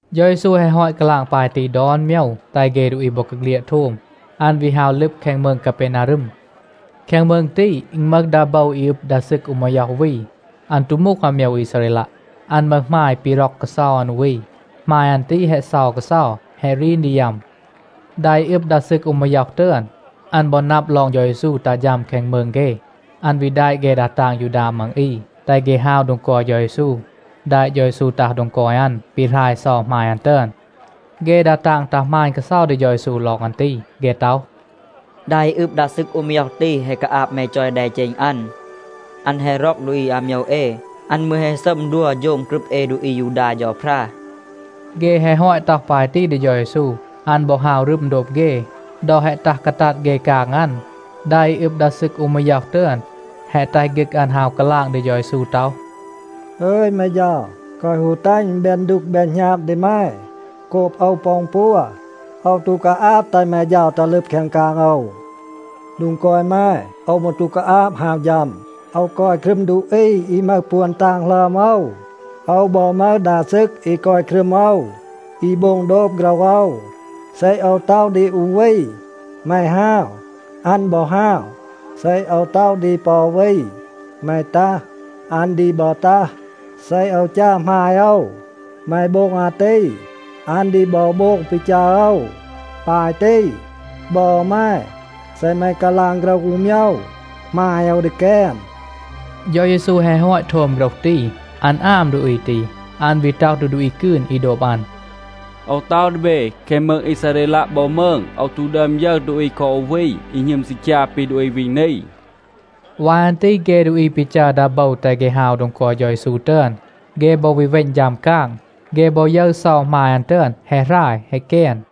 เฌา เยซู แฮะ ฮอต กาลาง ปาย ตี ดอน โมยว, แตห เฆ ดูอี บอกาเฆลียด โทม, อัน วี ฮาว ลึบ แคง มืง กาเปนารึม. แคง มืง ตี, อึณ มึห ดา โบว อี อึบ ดา ซึก อู มาย็อห วี. อัน ตู มูห อาโมยว อีซาเรลัะ. อัน มึห หมาย ปี ร็อก กาเซา อัน อู วี. หมาย อัน ตี แฮะ เซา กาเซา, แฮะ รีน ดี ยัม. ดา อี อึบ ดา ซึก อู มาย็อห ตึอน, อัน บอ นับ ลอง เฌา เยซู ตัห ฌัม แคง มืง เฆ, อัน วี แดะ เฆ ดา ตาง ยูดา มัง อี, แตห เฆ ฮาว โดง กอย เฌา เยซู, แดะ เฌา เยซู ตัห โดง กอย อัน, ปีหราย เซา หมาย อัน ตึอน. เฆ ดา ตาง ตัห หมาณ กาเซา ดี เฌา เยซู ลอง อัน ตี. เฆ ต็อห, “ดา อี อึบ ดา ซึก อู มาย็อห ตี, แฮะ กาอาบ แม จอย แดเจณ อัน. อัน แฮะ ร็อก ดูอี อาโมยว เอ. อัน มืร แฮะ ซัม ดัว โฌง กรึบ เอ ดูอี อายูดา เฌาพรา.” เฆ แฮะ ฮอต ต็อห ปาย ตี ดี เฌา เยซู, อัน บอ ฮาว รึม โดบ เฆ. ดอ แฮะ ตัห กาตัด เฆ กาง อัน, ดา อี อึบ ดา ซึก อู มาย็อห ตึอน แฮะ แตห ฆึก อัน ฮาว กาลาง ดี เฌา เยซู ต็อห, “อึย แม เฌา, แกวะ ฮู แตห อึณ แบน ดูก แบน หณาบ ดี แม โกบ โอว ปอ อึณ ปัว. โอว ตู กาอาบ แตห แม เฌา ตัห ลึบ แคง กาง โอว. โดง กอย แม, โอว มืร ตู กาอาบ ฮาว ฌัม. โอว กอย ครึม ดูอี อี มึห ปวน ตาง หลึอม โอว. โอว บอ มึห ดา ซึก อี กอย ครึม โอว, อี โบง โดบ โฆรห โอว. เซ โอว ต็อห ดี อู วี ‘แม ฮาว,’ อัน บอ ฮาว. เซ โอว ต็อห ดี ปอ อู วี, ‘แม ตัห,’ อัน ดี บอ ตัห. เซ โอว จัร หมาย โอว, ‘แม โบง อาตี,’ อัน ดี บอ โบง ปี จัร โอว. ปาย ตี, บอ แม, เซ แม กาลาง โฆรห อู โมยว, หมาย โอว ดี แกน.” เฌา เยซู แฮะ ฮอต โทม โฆรห ตี, อัน อาม ดูอี ตี. อัน วี ต็อห ดี ดูอี กืน อี โดบ อัน, “โอว ต็อห ดี เบ, แคง มืง อีซาเรลัะ บอ มืง โอว ตู ดึอม ยึร ดูอี คอ อู วี อี หณึม ซีคยา ปี ดูอี วี นี.” วาย อัน ตี เฆ ดูอี ปี จัร ดา โบว แตห เฆ ฮาว โดง กอย เฌา เยซู ตึอน, เฆ บอ วี เวณ ฌัม กาง, เฆ บอ ยึร เซา หมาย อัน ตึอน แฮะ หราย, แฮะ แกน.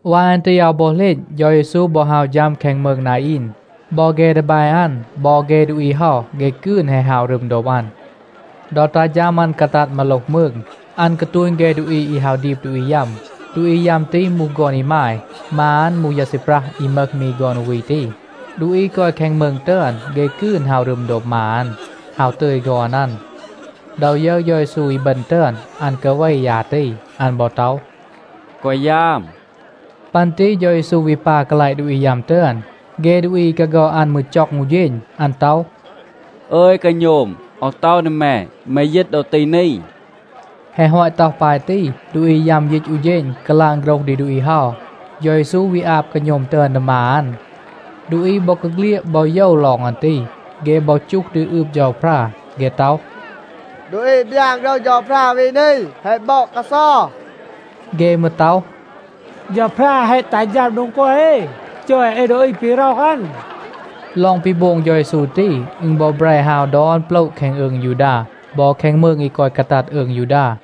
วาย อัน ตี อาว บอ เหลณ, เฌา เยซู บอ ฮาว ฌัม แคง มืง นาอีน. บอ เฆ ดีแบ อัน, บอ เฆ ดูอี เฮา เฆ กืน แฮะ ฮาว รึม โดบ อัน. ดอ ตัห ฌัม อัน กาตัด มาโลห มืง, อัน กาตูณ เฆ ดูอี อี ฮาว ดีบ ดูอี ยัม. ดูอี ยัม ตี มูห ฆอน อีมาย. มา อัน มูห ยา ซีปรัห อี มึห มี ฆอน อู วี ตี. ดูอี กอย แคง มืง ตึอน, เฆ กืน ฮาว รึม โดบ มา อัน, ฮาว ตึย ฆอน อัน. ดอ ยึร เฌา เยซู อีบึณ ตึอน, อัน กาเว ยา ตี. อัน บอ ต็อห, “แกวะ ยาม.” ปัน ตี เฌา เยซู วี ปา กาลาต ดูอี ยัม ตึอน. เฆ ดูอี อี กาฆอด อัน มืร จ็อง อู เฌณ. อัน ต็อห, “อึย กาโณม, โอว ต็อห ดี แม, แม ยีต ดอ ตี นี,” แฮะ ฮอต ต็อห ปาย ตี, ดูอี ยัม ยีต อู เฌณ, กาลาง โฆรห ดี ดูอี เฮา. เฌา เยซู วี อาบ กาโณม ตึอน ดี มา อัน. ดูอี บอกาเฆลียด บอ โยว ลอง อัน ตี. เฆ บอ จูห ดี อืบ เฌาพรา. เฆ ต็อห, “ดูอี บยาน โฆรห เฌาพรา วี นี แฮะ บอด กาเซา.” เฆ มืร ต็อห, “เฌาพรา แฮะ ตัห ฌัม โดง กอย เอ, จอย เอ ดูอี ปี ร็อห อัน.” ลอง ปี โบง เฌา เยซู ตี, อึณ บอ แบร ฮาว ดอน โปละ แคง อืง ยูดา บอ แคง มืง อี กอย กาตัด อืง ยูดา.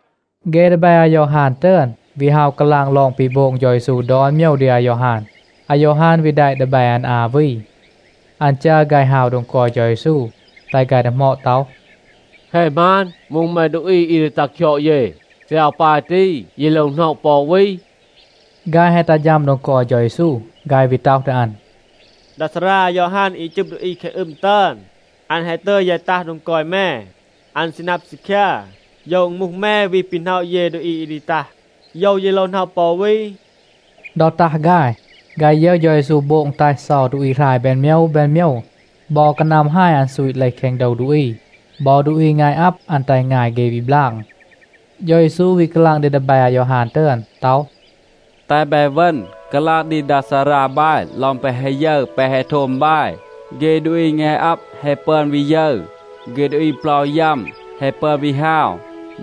เฆ ดีแบ อายอฮาน ตึอน วี ฮาว กาลาง ลอง ปี โบง เฌา เยซู ดอน โมยว ดี อายอฮาน. อายอฮาน วี แดะ ดีแบ อัน อา วี. อัน จัร ฆาย ฮาว โดง กอย เฌา เยซู, แตห ฆาย ดีหมอด ต็อห, “แฮะ หมาน, มูห แม ดูอี อี ดี ตัห คยอด เย? เซ อาว ปาย ตี, เย โลว หน็อะ ปอ อู วี?” ฆาย แฮะ ตัห ฌัม โดง กอย เฌา เยซู, ฆาย วี ต็อห ดี อัน, “ดา ซารา อายอฮาน อี จึบ ดูอี แคง อึม ตึอน, อัน แฮะ ตึย ยาย ตัห โดง กอย แม. อัน ซี นับ ซีคยา, โยว อึณ มูห แม, วี ปี หน็อะ เย ดูอี อี ดี ตัห? โยว เย โลว หน็อะ ปอ อู วี?” ดอ ตัห ฆาย, ฆาย ยึร เฌา เยซู โบง แตห เซา ดูอี หราย แบน โมยว แบน โมยว. บอ กานัม ฮาย อัน ซูต เลห แคง โดว ดูอี. บอ ดูอี งาย อับ, อัน แตห งาย เฆ วี บลาง. เฌา เยซู วี กาลาง ดี ดีแบ อายอฮาน ตึอน ต็อห, “แตห บาย เวณ, กาลาง ดี ดา ซารา บาย ลอง แปะ แฮะ ยึร แปะ แฮะ โทม บาย. เฆ ดูอี งาย อับ แฮะ ปึอน วี ยึร. เฆ ดูอี เปลา ยัม แฮะ ปึอน วี ฮาว.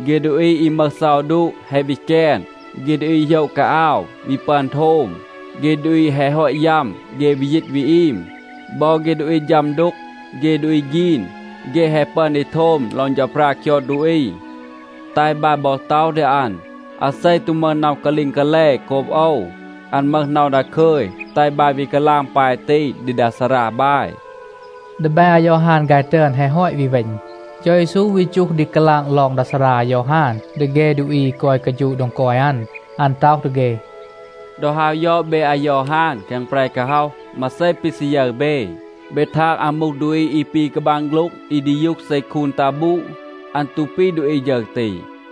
เฆ ดูอี อี มึห เซา ดูะa แฮะ วี แกน. เฆ ดูอี โหยะ กาอาว วี ปึอน โทม. เฆ ดูอี แฮะ ฮอต ยัม, เฆ วี ยีต วี อีม. บอ เฆ ดูอี ฌัม ดูก, เฆ ดูอี ฆีน, เฆ แฮะ ปึอน ดี โทม ลอง เฌาพรา คยอด ดูอี. แตห บาย บอ ต็อห ดี อัน, อาเซ ตู มึห น็อห กาลีง กาแล โกบ โอว, อัน มึห น็อห ดาคึย. แตห บาย วี กาลาง ปาย ตี, ดี ดา ซารา บาย.” ดีแบ อายอฮาน ฆาย ตึอน แฮะ ฮอต วี เวณ, เฌา เยซู วี จูห ดี กาลาง ลอง ดา ซารา อายอฮาน ดี เฆ ดูอี อี กอย กาฌูะ โดง กอย อัน. อัน ต็อห ดี เฆ, “ดอ ฮาว ยอด เบ อายอฮาน แคง แปร กาฮ็อห, มาเซ ปี ซี ยึร เบ? เบ ทาง อัน มูห ดูอี อี ปี กาบาง โฆ็ลง อี ดียูห เซ คูน ตัห บูด? อัน ตู ปี ดูอี ฌึร ตี.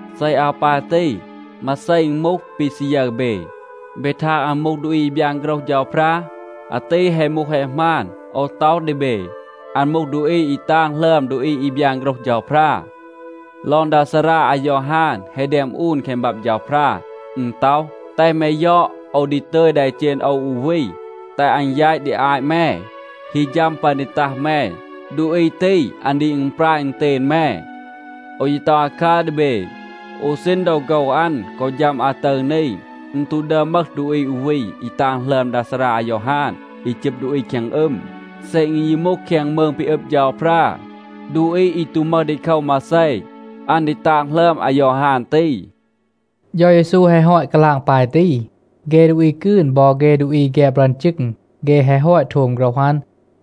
เซ อาว ปาย ตี, มาเซ อึณ มูห, ปี ซี ยึร เบ? เบ ทาง อัน มูห ดูอี อี บยาน โฆรห เฌาพรา? อาตี แฮะ มูห, แฮะ หมาน. โอว ต็อห ดี เบ, อัน มูห ดูอี อี ตาง หลึอม ดูอี อี บยาน โฆรห เฌาพรา. ลอง ดา ซารา อายอฮาน แฮะ แดม อูน แคง บับ เฌาพรา. อึณ ต็อห, ‘แตห แม ยอด, โอว ดี ตึย แดเจณ โอว อู วี, แตห อัน แยต ดี อาต แม. ฮี ฌัม ปัน ดี ตัห แม, ดูอี ตี, อัน ดี อึณปราย อึณเตณ แม.’ โอว ยี ต็อห อาคัร ดี เบ, อู ซีณ ดอ โฆว อัน กอ ฌัม อาตึร นี, อึณ ตู ดึอม มึห ดูอี อู วี อี ตาง หลึอม ดา ซารา อายอฮาน อี จึบ ดูอี แคง อึม. เซ อึณ ยี มูห แคง มืง ปี อึบ เฌาพรา, ดูอี อี ตู มึห ดีโคว มาเซ, อัน ดี ตาง หลึอม อายอฮาน ตี.” เฌา เยซู แฮะ ฮอต กาลาง ปาย ตี, เฆ ดูอี กืน บอ เฆ ดูอี แฆบ รึอน จึง, เฆ แฮะ ฮอต โทม โฆรห อัน,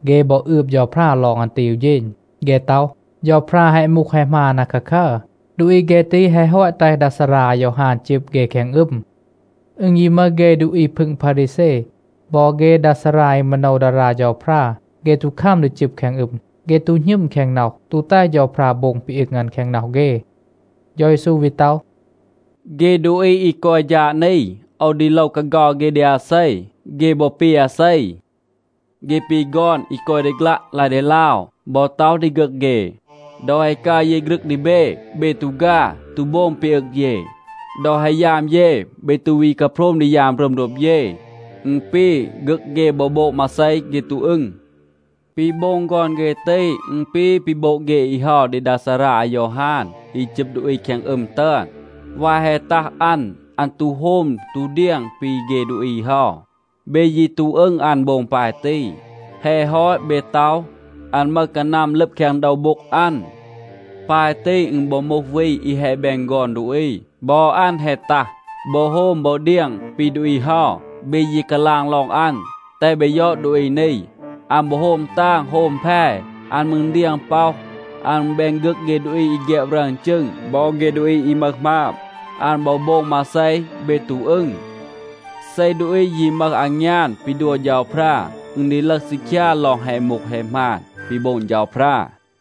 เฆ บอ อืบ เฌาพรา ลอง อัน ตี อู เฌณ. เฆ ต็อห, เฌาพรา แฮะ มูห, แฮะ หมาน อาคาคัร. ดูอี เฆ ตี แฮะ ฮอต แตห ดา ซารา อายอฮาน จึบ เฆ แคง อึม. อึณ ยี มึห เฆ ดูอี พึง พารีแซ บอ เฆ ดา ซารา อี มาโนว ดารา เฌาพรา, เฆ ตู คัม ดี จึบ แคง อึม. เฆ ตู หณึม แคง น็อห, ตู แตห เฌาพรา โบง ปี อึง อัน แคง น็อห เฆ. เฌา เยซู วี ต็อห, “เฆ ดูอี อี กอย ฌาด นี, โอว ดี โลว กาเฆา เฆ ดี อาเซ? เฆ บอ ปี อาเซ? เฆ ปี ฆอน, อี กอย ดี ฆลัะ ลาย ดีลาว, บอ ต็อห ดี ฆึก เฆ, ‘ดอ แฮะ กัร เย ฆรึง ดี เบ, เบ ตู ฆา, ตู โบง ปี อึง เย. ดอ แฮะ ยาม เย, เบ ตู วี กาโพรม ดี ยาม รึม โดบ เย.’ อึณ ปี, ฆึก เฆ บอ โบง มาเซ, เฆ ตู อึง. ปี โบง ฆอน เฆ ตี, อึณ ปี ปี โบง เฆ อี เฮา ดี ดา ซารา อายอฮาน อี จึบ ดูอี แคง อึม ตึอน. วาย แฮะ ตัห อัน, อัน ตู โฮม ตู เดียง ปี เฆ ดูอี เฮา. เบ ยี ตู อึง อัน โบง ปาย ตี. แฮะ ฮอต, เบ ต็อห, อัน มึห กานัม ลึบ แคง โดว โบ็ง อัน. ปาย ตี อึณ บอ มูห วี อี แฮะ แบน ฆอน ดูอี. บอ อัน แฮะ ตัห, บอ โฮม บอ เดียง ปี ดูอี เฮา. เบ ยี กาลาง ลอง อัน, ‘แตห เบ ยอด ดูอี นี. อัน บอ โฮม ตาง โฮม แพ, อัน มืร เดียง ป็อห. อัน แบน ฆึก เฆ ดูอี อี แฆบ รึอน จึง บอ เฆ ดูอี อี มึห หมาบ.’ อัน บอ โบง มาเซ, เบ ตู อึง. เซ ดูอี ยี มึห อางยาน ปี ดัว เฌาพรา, อึณ ดี ลึห ซีคยา ลอง แฮะ มูห แฮะ หมาน ปี โบง เฌาพรา.”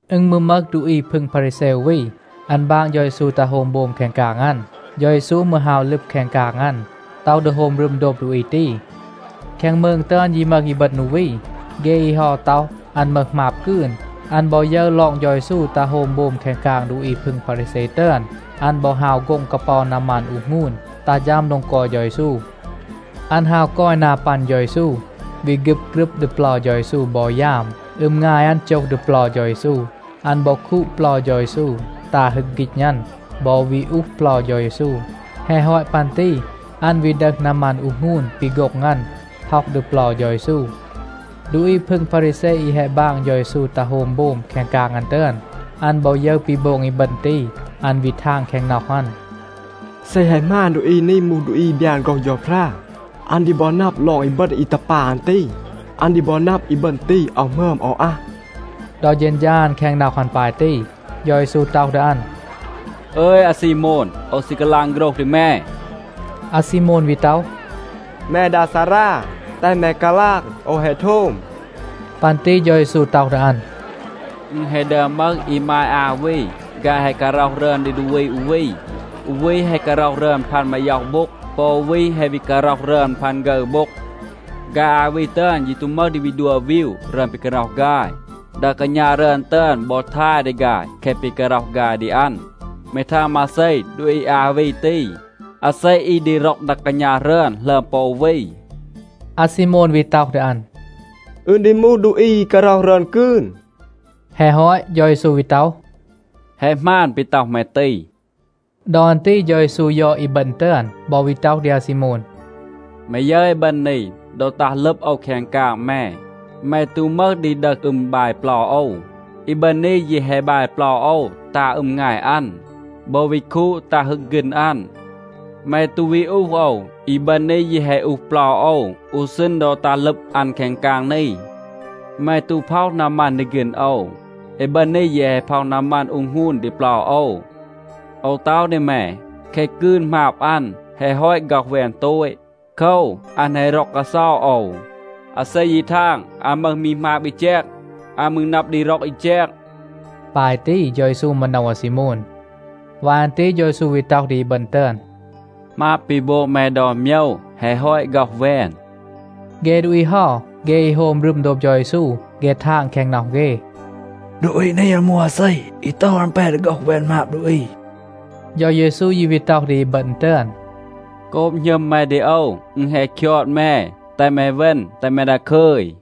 อึณ มืร มึห ดูอี พึง พารีแซ อู วี, อัน บาง เฌา เยซู ตัห โฮม โบม แคง กาง อัน. เฌา เยซู มืร ฮาว ลึบ แคง กาง อัน, ต็อห ดี โฮม รึม โดบ ดูอี ตี. แคง มืง ตึอน ยี มึห อีบึณ อู วี. เฆ อี เฮา ต็อห, อัน มึห หมาบ กืน. อัน บอ ยึร ลอง เฌา เยซู ตัห โฮม โบม แคง กาง ดูอี พึง พารีแซ ตึอน, อัน บอ ฮาว โฆ็ง กาเปา นามัน อูห หงูน, ตัห ฌัม โดง กอย เฌา เยซู. อัน ฮาว กอย นา ปัน เฌา เยซู, วี ฆึบ กรึบ ดี เปลา เฌา เยซู บอ ยาม. อึม งาย อัน โจห ดี เปลา เฌา เยซู. อัน บอ คูด เปลา เฌา เยซู, ตา ฮึก ฆีณ อัน บอ วี อูห เปลา เฌา เยซู. แฮะ ฮอต ปัน ตี อัน วี ดึห นามัน อูห หงูน ปี โฆ็ง อัน, พ็อห ดี เปลา เฌา เยซู. ดูอี พึง พารีแซ อี แฮะ บาง เฌา เยซู ตัห โฮม โบม แคง กาง อัน ตึอน, อัน บอ ยึร ปี โบง อีบึณ ตี, อัน วี ทาง แคง น็อห อัน, “เซ แฮะ หมาน, ดูอี นี มูห ดูอี อี บยาน โฆรห เฌาพรา, อัน ดี บอ นับ ลอง อีบึณ อี ตัห ปา อัน ตี. อัน ดี บอ นับ, อีบึณ ตี อาว หมึอม, อาว อัห.” ดอ เฌณฌา อัน แคง น็อห อัน ปาย ตี, เฌา เยซู ต็อห ดี อัน, “อึย อาซีโมน, โอว ซี กาลาง โฆรห ดี แม.” อาซีโมน วี ต็อห, “แม ดา ซารา, แตห แม กาลาง, โอว แฮะ โทม.” ปัน ตี เฌา เยซู ต็อห ดี อัน, “อึณ แฮะ ดึอม มึห อีมาย อา วี, ฆาย แฮะ การ็อห รึอน ดี ดูอี อู วี. อู วี แฮะ การ็อห รึอน พัน มาย็อห โบ็ง. ปอ อู วี แฮะ การ็อห รึอน พัน ฆึร โบ็ง.b ฆาย อา วี ตึอน ยี ตู มึห ดี ดัว วีว รึอน ปี การ็อห ฆาย. ดา กาณา รึอน ตึอน บอ ทาย ดี ฆาย แคะ ปี การ็อห ฆาย ดี อัน. แม ทาง มาเซ? ดูอี อา วี ตี, อาเซ อี ดี ร็อก ดา กาณา รึอน หลึอม ปอ อู วี?” อาซีโมน วี ต็อห ดี อัน, “อึณ ดี มูห ดูอี อี การ็อห รึอน กืน.” แฮะ ฮอต, เฌา เยซู วี ต็อห, “แฮะ หมาน ปี ต็อห แม ตี.” ดอ อัน ตี เฌา เยซู ยอด อีบึณ ตึอน, บอ วี ต็อห ดี อาซีโมน, “แม ยึร อีบึณ นี? ดอ ตัห ลึบ โอว แคง กาง แม, แม ตู มึห ดี ดึห อึม, บาย เปลา โอว. อีบึณ นี ยี แฮะ บาย เปลา โอว ตา อึม งาย อัน, บอ วี คูด ตา ฮึก ฆีณ อัน. แม ตู วี อูห โอว. อีบึณ นี ยี แฮะ อูห เปลา โอว อู ซีณ ดอ ตัห ลึบ อัน แคง กาง นี.c แม ตู พ็อห นามัน ดี ฆีณ โอว. อีบึณ นี ยี แฮะ พ็อห นามัน อูห หงูน ดี เปลา โอว. โอว ต็อห ดี แม, แคะ กืน หมาบ อัน, แฮะ ฮอต ฆ็อห แวน โตต. โคว, อัน แฮะ ร็อก กาเซา โอว. อาเซ ยี ทาง, อัน มึห มี หมาบ อี แจก, อัน มืร นับ ดี ร็อก อี แจก.” ปาย ตี เฌา เยซู มาโนว อาซีโมน. วาย อัน ตี เฌา เยซู วี ต็อห ดี อีบึณ ตึอน, “หมาบ ปี โบง แม ดอน โมยว แฮะ ฮอต ฆ็อห แวน.” เฆ ดูอี เฮา, เฆ อี โฮม รึม โดบ เฌา เยซู, เฆ ทาง แคง น็อห เฆ, “ดูอี นี, อัน มูห อาเซ, อี ต็อห, อัน แป ดี ฆ็อห แวน หมาบ ดูอี?” เฌา เยซู ยี วี ต็อห ดี อีบึณ ตึอน, “โกบ หณึม แม ดี โอว, อึณ แฮะ คยอด แม. แตห แม เวณ, แตห แม ดาคึย.”